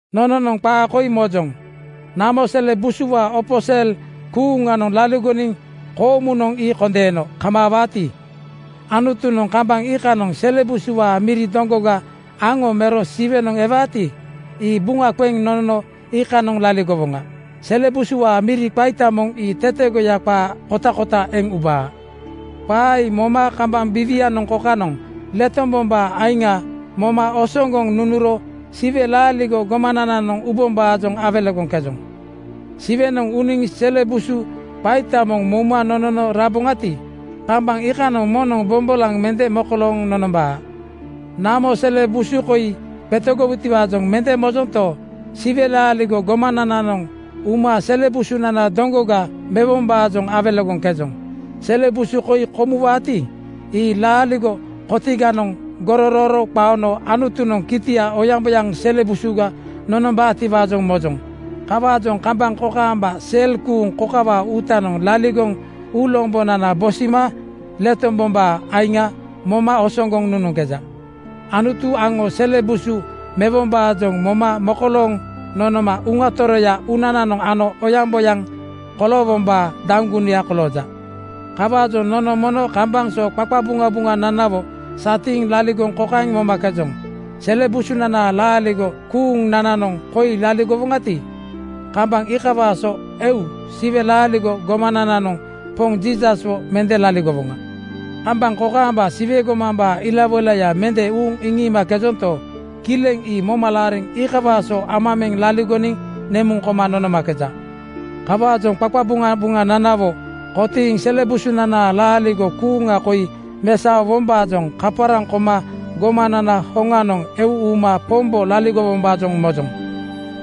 Nononoŋ qaa koi mojoŋ: Namo sele busuwaa opo sel kuuŋanoŋ laligoniŋ koomunoŋ ii kondeeno kamaawaati, Anutunoŋ kambaŋ iikanoŋ sele busuwaa miri doŋgoga aŋo mero Siwenoŋ ewaati, ii buŋa qeŋ nonono iikanoŋ laligowoŋa. Sele busuwaa miri qaita moŋ ii tetegoya qaa kotakota eŋ ubaa. Qaa ii moma kambaŋ biiwianoŋ kokanoŋ letombombaa aiŋa moma osoŋgoŋ nunuro Siwe laaligo gomanananoŋ ubombaajoŋ awelegoŋkejoŋ. Siwenoŋ uniŋ sele busu qaita moŋ mouma nonono raboŋati, kambaŋ iikanoŋ moŋnoŋ bombolaŋ mende mokolooŋ nonombaa. Namo sele busu koi qetegowutiwaajoŋ mende mojonto, Siwe laaligo gomanananoŋ uma sele busunana doŋgoga mewombaajoŋ awelegoŋkejoŋ. Sele busu koi komuwaati, ii laaligo kotiganoŋ gogoro qaono Anutunoŋ kitia oyaŋboyaŋ sele busuga nonombaatiwaajoŋ mojoŋ. Kawaajoŋ kambaŋ kokaamba sel kuuŋ kokawaa uutanoŋ laligoŋ uulombonana bosima letombombaa aiŋa moma osoŋgoŋ nunuŋkeja. Anutu aŋo Siwe sele busu mewombaajoŋ moma mokolooŋ nonoma Uŋa Toroya uunananoŋ ano oyaŋboyaŋ koloowombaa daŋgunuya kolooja. Kawaajoŋ nono mono kambaŋ so qaqabuŋabuŋananawo satiiŋ laligoŋ kokaeŋ momakejoŋ: Sele busunanaa laaligo kuuŋnananoŋ koi laligowoŋati, kambaŋ iikawaa so eu Siwe laaligo gomanananoŋ Poŋ Jiisaswo mende laligowoŋa. Kambaŋ kokaamba Siwe gomambaa ilawoilaya mende uuŋ iŋiimakejonto, kileŋ ii moma laariŋ iikawaa so ama meŋ laligoniŋ nemuŋ koma nonomakeju. Kawaajoŋ qaqabuŋabuŋananawo kotiiŋ sele busunanaa laaligo kuuŋa koi mesaowombaajoŋ kaparaŋ koma gomanana hoŋanoŋ eu uma Pombo laligowombaajoŋ mojoŋ.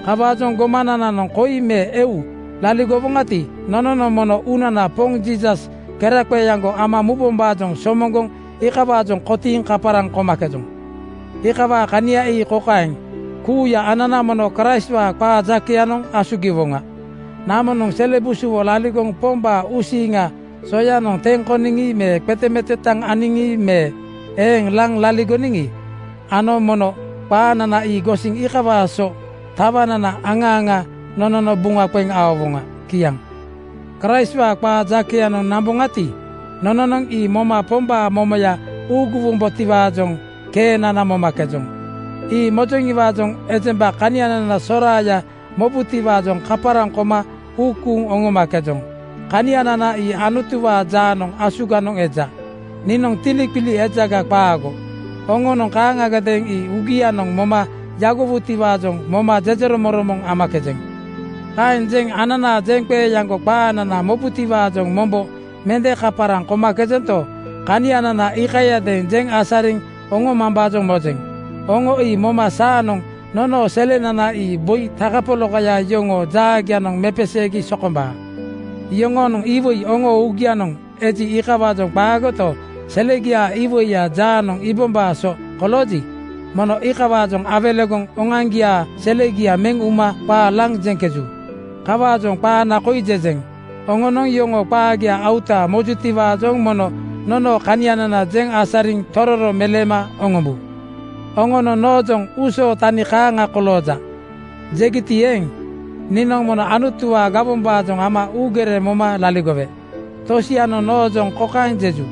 Kawaajoŋ gomanananoŋ koi me eu laligowoŋati, nononoŋ mono uunana Poŋ Jiisas keraqeeaŋgo ama mubombaajoŋ somoŋgoŋ iikawaajoŋ kotiiŋ kaparaŋ komakejoŋ. Iikawaa kania ii kokaeŋ: Kuuya anana mono Kraistwaa qaa jakeyanoŋ asugiwoŋa. Namonoŋ sele busuwo laligoŋ Pombaa uusiiŋa soyanoŋ teŋ koniŋi me qetemetetaŋ aniŋi me eeŋ laŋ laligoniŋi, aŋo mono qaanana ii gosiŋ iikawaa so tawanana aŋa aŋa nonono buŋa qeŋ aowoŋa. Kiaŋ. Kraistwaa qaa jakeyanoŋ namboŋati, nononoŋ ii moma Pombaa momoya uuguwombotiwaajoŋ keenana momakejoŋ. Ii mojoŋiwaajoŋ ejemba kanianana soraaya mobutiwaajoŋ kaparaŋ koma uu kuuŋ oŋomakejoŋ. Kanianana ii Anutuwaa jaanoŋ asuganoŋ eja. Niinoŋ tiliqili ejaga qaago, oŋonoŋ kaaŋagadeeŋ ii uugianoŋ moma yagowutiwaajoŋ moma jejeromoŋromoŋ amakejeŋ. Kaeŋ jeŋ ananaa jeŋqeeaŋgo qaanana mobutiwaajoŋ mombo mende kaparaŋ komakejento, kanianana iikayadeeŋ jeŋ asariŋ oŋomambaajoŋ mojeŋ. Oŋo ii moma saanoŋ nonoo selenana ii boi takapolakaya yoŋoo jaagianoŋ mepeseegi sokombaa. Yoŋonoŋ iwoi oŋoo uugianoŋ eji, iikawaajoŋ qaagoto, selegiaa iwoiya jaanoŋ iibombaa so kolooji, mono iikawaajoŋ awelegoŋ oŋoaŋgiaa selegia meŋ uma qaa laŋ jeŋkeju. Kawaajoŋ qaana koi jejeŋ. Oŋonoŋ yoŋoo qaagia auta (gorosoŋa) mojutiwaajoŋ mono nonoo kanianana jeŋ asariŋ tororo meleema oŋombu. Oŋonoŋ noojoŋ “Uusoo tani kaaŋa kolooja,” jegiti eeŋ, niinoŋ mono Anutuwaa gawombaajoŋ ama uugere moma laligowe. Tosianoŋ noojoŋ kokaeŋ jeju,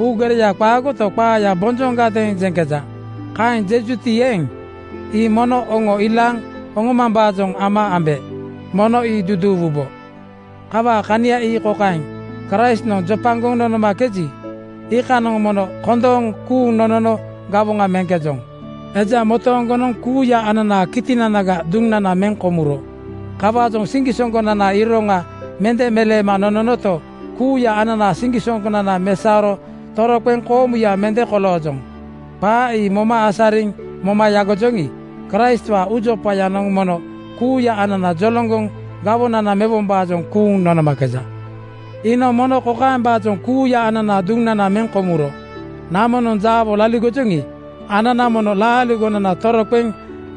“Uugereya qaagoto, qaaya bonjoŋa-gadeeŋ jeŋkeja.” Kaeŋ jejuti eeŋ, ii mono oŋo ilaaŋ oŋombombaajoŋ ama ambe. Mono ii duduuwubo. Kawaa kania ii kokaeŋ: Kraistnoŋ jopagoŋ nonomakeji, iikanoŋ mono kondooŋ kuuŋ nonono gawoŋa meŋkejoŋ. Eja motooŋgonoŋ kuuya ananaa kitinanaga duŋnana meŋ komuro. Kawaajoŋ siŋgisoŋgonanaa iroŋa mende meleema nononoto, kuuya ananaa siŋgisoŋgonana mesaoro toroqeŋ koomuya mende koloojoŋ. Qaa ii moma asariŋ moma yagojoŋi, Kraistwaa uujopayanoŋ mono kuuya anana joloŋgoŋ gawoŋa mewombaajoŋ kuuŋ nonomakeja. Iinoŋ mono kokaembaajoŋ kuuya ananaa duŋnana meŋ komuro: Namonoŋ jaawo laligojoŋi, anana mono laaligonana toroqeŋ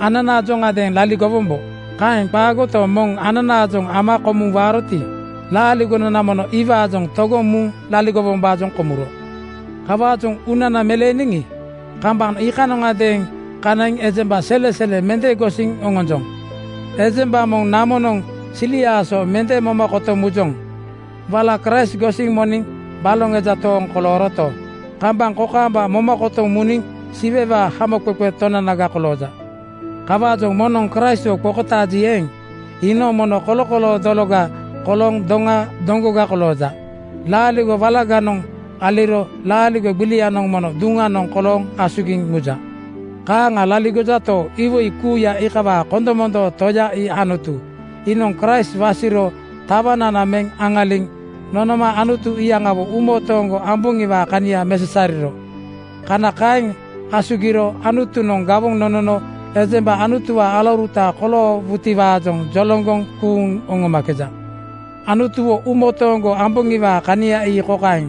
ananaajoŋadeeŋ laligowombo. Kaeŋ qaagoto, moŋ ananaajoŋ ama komuŋ waaroti, laaligonana mono iwaajoŋ togoŋ muŋ laligowombaajoŋ komuro. Kawaajoŋ uunana meleeniŋi, kambaŋ iikanoŋadeeŋ kanaiŋ ejemba selesele mende gosiŋ oŋonjoŋ. Ejemba moŋ namonoŋ siliaa so mende moma kotoŋ mujoŋ. Wala Kraist gosiŋ moniŋ baloŋ eja tooŋ kolooroto, kambaŋ kokaamba moma kotoŋ muniŋ Siwewaa Hamoqeqe Tonanaga kolooja. Kawaajoŋ moŋnoŋ Kraistwo qokotaaji eeŋ, iinoŋ mono kolokoloo dologa kolooŋ doŋa doŋgoga kolooja. Laaligo walaganoŋ aliro laaligo gbilianoŋ mono duŋanoŋ kolooŋ asugiŋ muja. Kaaŋa laligojato, iwoi kuuya iikawaa kondomondoo Toya ii Anutu. Iinoŋ Kraist wasiro tawanana meŋ aŋaliŋ nonoma Anutu iyaŋawo uumotooŋgo amboŋiwaa kania mesasariro. Kana kaeŋ asugiro Anutunoŋ gawoŋ nonono ejemba Anutuwaa alauruta koloowutiwaajoŋ joloŋgoŋ kuuŋ oŋomakejoŋ. Anutuwo uumotooŋgo amboŋiwaa kania ii kokaeŋ: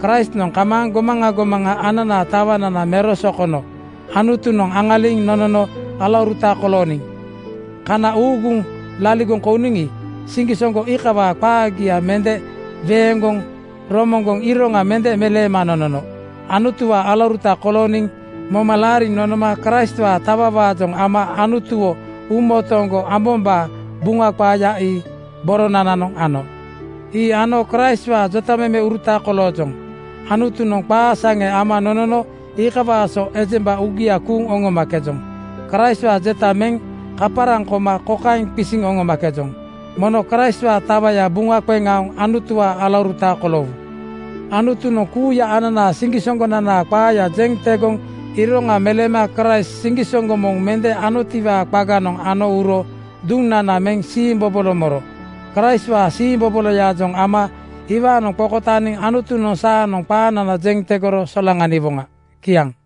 Kraistnoŋ kamaaŋ gomaŋa gomaŋa ananaa tawanana mero sokono Anutunoŋ aŋaliŋ nonono alauruta kolooniŋ. Kana uuguŋ laligoŋ kouniŋi, siŋgisoŋgo iikawaa qaagia mende weeŋgoŋ romoŋgoŋ iroŋa mende meleema nonono. Anutuwaa alauruta kolooniŋ moma laariŋ nonoma Kraistwaa tawawaajoŋ ama Anutuwo uumotooŋgo ambombaa Buŋa qaaya ii boronananoŋ ano. Ii ano Kraistwaa jotamemeuruta koloojoŋ. Anutunoŋ qaa saŋe ama nonono iikawaa so ejemba uugia kuuŋ oŋomakejoŋ. Kraistwaa jeta meŋ kaparaŋ koma kokaeŋ qisiŋ oŋomakejoŋ: Mono Kraistwaa tawaya buŋa qeŋ aoŋ Anutuwaa alauruta koloowu. Anutunoŋ kuuya ananaa siŋgisoŋgonanaa qaaya jeŋ tegoŋ iroŋa meleema Kraist siŋgisoŋgo moŋ mende anotiwaa qaganoŋ ano uro duŋnana meŋ siimbobolo moro. Kraistwaa siimboboloyaajoŋ ama iwaanoŋ qokotaaniŋ Anutunoŋ saanoŋ qaanana jeŋ tegoro solaŋaniwoŋa. Kiaŋ.